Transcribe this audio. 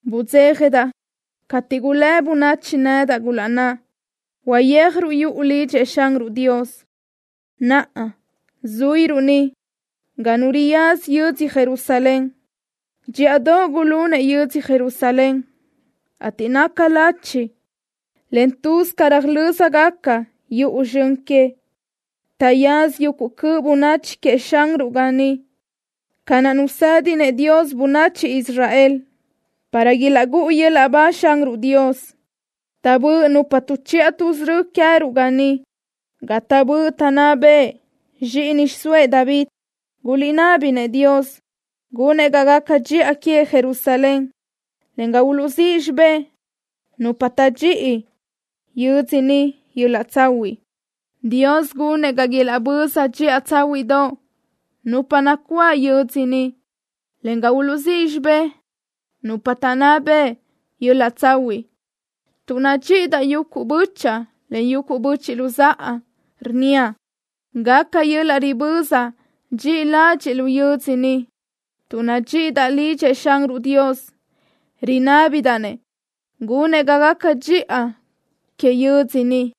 Budzéjadaʼ cateʼ gulë́ bönachi nedaʼ, gulaʼnná: “Uyeajruʼ yuʼu lidxëʼ Xanruʼ Dios.” Naʼa zuíruʼ ni ga nu riyaza yödzö Jerusalén. Dxíʼadoʼ gulunëʼ yödzö Jerusalén, ateʼ naca lachi, en tuz ca röjlö́zgaca yuʼu zxön que. Taʼyaza yuguʼ cöʼ bönachi queëʼ Xanruʼ ga ni ca naʼ nusédinëʼ Dios bönachi Israel, para ilaʼgúʼu yöl-laʼ ba Xanruʼ Dios. Taʼbö́ʼ nupa tuʼchiʼa tuʼsörö́ queëruʼ ga ni, ga taʼbö́ʼ taʼnná bëʼ zxíʼini xiʼsóëʼ David. Guliʼnábinëʼ Dios gunëʼ ga gaca dxiʼa que Jerusalén, en ga uluʼzíʼ xibé nupa taʼdxíʼi yödzö ni yöl-laʼ tsahuiʼ. Dios gunëʼ ga ilaʼböza dxiʼa tsáhuiʼdoʼ nupa nacuáʼ yödzö ni, en ga uluʼzíʼ xibé nupa taʼnná bëʼ yöl-laʼ tsahuiʼ. Tuʼ nadxíʼidaʼ yuguʼ bö́chaʼa, en yuguʼ böchiʼ luzáʼa, rnníaʼ: “Gaca yöl-laʼ riböza dxi ladxiʼ lu yödzö ni.” Tuʼ nadxíʼidaʼ lidxëʼ Xanruʼ Dios, rinábidaʼ-nëʼ gunëʼ ga gaca dxiʼa que yödzö ni.